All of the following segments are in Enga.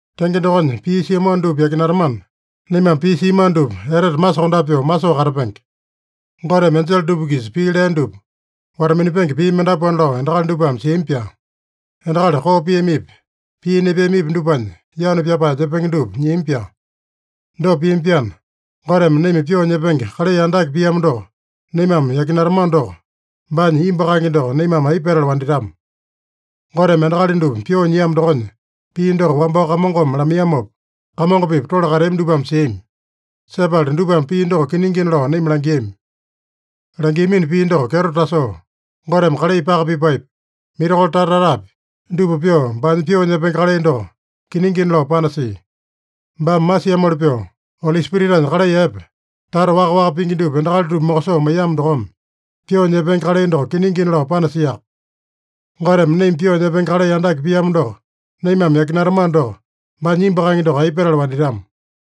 Tenge dokonya, pii siamano dupa yakinatamana, naimame pii siamano dupa etete masokondape pyoo masoo katapenge. Goteme enjele dupa-kisa pii lea dupa wata-minapenge pii mendapuana lao endakali dupame siami-pyaa. Endakali koo piamipi, pii nepeamipi dupanya, yanu pyapae nyepenge dupa nyiami-pyaa. Dopa piami-pyaana, Goteme naima pyoo nyepenge kalai andake piamo doko naimame yakinatamano doko, baanya imbu kaenge doko naimame aipa petala wanditama? Goteme endakali dupa pyoo nyiamo dokonya pii doko wambao Kamongome lamaiyamopa, Kamongo-pipa tole kateami dupame siami. Sepala dupame pii doko kiningina lao naima langiami. Langiamino pii doko kyeto tasoo Goteme kalai paka pipaepi, mirakolo tata-tatapi, dupa pyoo, baanya pyoo nyepenge kalai doko kiningina lao panasia. Baame masiamoli pyoo, Oli Spiritanya kalai epe tata waka-waka pingi dupa endakali dupa mokosoo maiyamo dokome, pyoo nyepenge kalai doko kiningina lao panasiaka. Goteme naima pyoo nyepenge kalai andake piamo doko naimame yakinatamano doko, baanya imbu kaenge doko aipa petala wanditama?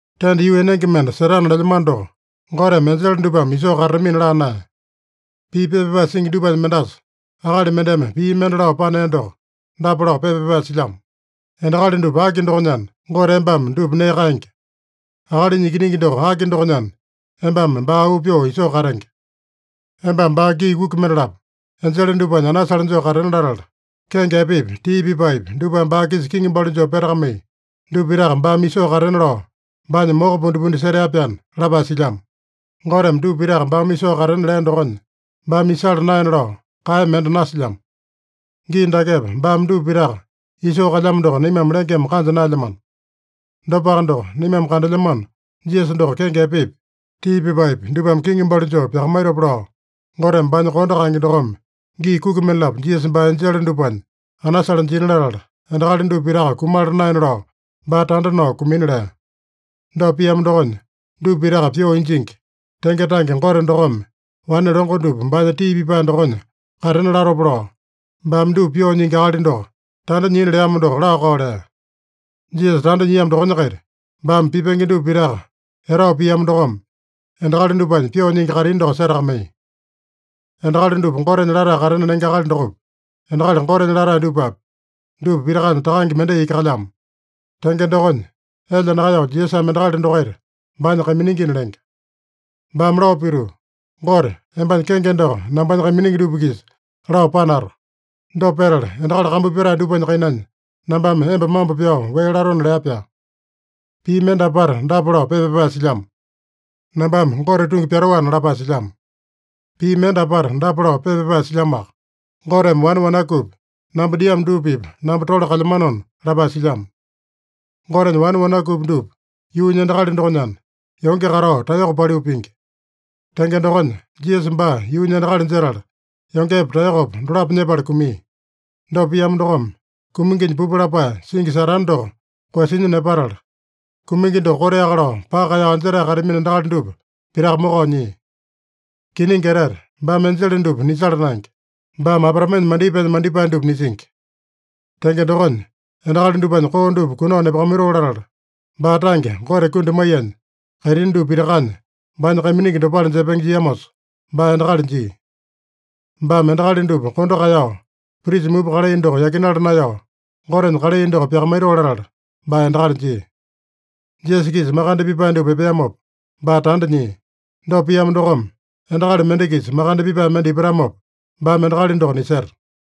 Tenda yuu enenge mende setana lelyamano doko, Goteme enjele dupame isoo katatamina laa naeya. Pii pepa pyapae singi dupanya mendasa, akali mendeme pii mende lao panea doko dapa lao pepa pyapae silyamo: “Endakali dupa aki dokonyana, Gote embame dupa nee kaenge? Akalinya ikiningi doko aki dokonyana, embame baa auu pyoo isoo katenge? Embame baa gii kuki mendalapo enjele dupanya anasale joo katena latala, kenge epepi, tii pipaepi, dupame baa-kisa kiŋi balu joo petakamai, dupa pitaka baame isoo katena lao baanya moko pundipundi setea-pyaana” lapae silyamo. Goteme dupa pitaka baame isoo katena lea dokonya, baame isala naena lao kaeya mende nasilyamo. Gii dakepa baame dupa pitaka isoo kalyamo doko naimame lengeme kanja naelyamano. Dopaka doko, naimame kandelyamano Jisasa doko kenge epepi, tii pipaepi, dupame kiŋi balu joo pyakamaitopa lao, Goteme baanya kondo kaenge dokome gii kuki mendalapo Jisasa baa enjele dupanya anasale jina latala, endakali dupa pitaka kumala naena lao baa tanda nao kumina lea. Dopa piamo dokonya, dupa pitaka pyoo injingi, tenge tange Gote dokome wane longo dupa baanya tii pipae dokonya katena latopa lao, baame dupa Pyoo Nyingi Akali doko tanda nyina leamo doko laa-kao lea. Jisasa tanda nyiamo dokonya-kaita, baame pipenge dupa pitaka etao piamo dokome, endakali dupanya pyoo nyingi kaitini doko setakamaiya. Endakali dupa Gotenya latae katena lenge akali dokopi, endakali Gotenya latae dupapi, dupa pitakanya Takange mendai iki kalyamo. Tenge dokonya, elya nakaeyao Jisasame endakali dokaita baanya kaiminingina lenge. Baame lao pituu, “Gote, embanya kenge doko nambanya kaiminingi dupa-kisa lao panato. Dopa petala endakali kambu pyatae dupanya kainanya nambame emba mambo pyao wee latona” lea-pyaa. Pii mende apata dapa lao pepa pyapae silyamo: “Nambame Gote tungi pyatoana” lapae silyamo. Pii mende apata dapa lao pepa pyapae silyamoaka: “Goteme wane wanakupi namba diamo dupa-pipa namba tole kalyamanona” lapae silyamo. Gotenya wane wanakupi dupa yuunya endakali dokonyana, yonge katao taeyoko paliu pingi. Tenge dokonya, Jisasa baa yuunya endakali jetala, yongepa taeyokopa dolapo nyepala kumia. Dopa piamo dokome, kuminginya pupu lapae singi Satane doko koeyasinya nepatala, kumingi doko koteaka lao paka kaeyao anjetae kateamino endakali dupa pitaka mokao nyia. Kiningi etete, baame enjele dupa nisala naenge. Baame Abraamenya mandipaenya mandipae dupa nisingi. Tenge dokonya, endakali dupanya koo dupa kunao nepakamaitoo latala, baa tange Gote kundi maiyanya, kaitini dupa pitakanya baanya kaiminingi dopale jepenge jiamosa baa endakali jia. Baame endakali dupa kondo kaeyao, prisa mupa kalai doko yakinala naeyao, Gotenya kalai doko pyakamaitoo latala baa endakali jia. Jisasa-kisa makande pipae dupa epeamopa, baa tanda nyia. Dopa piamo dokome, endakali mende-kisa makande pipae mende ipatamopa, baame endakali doko niseta.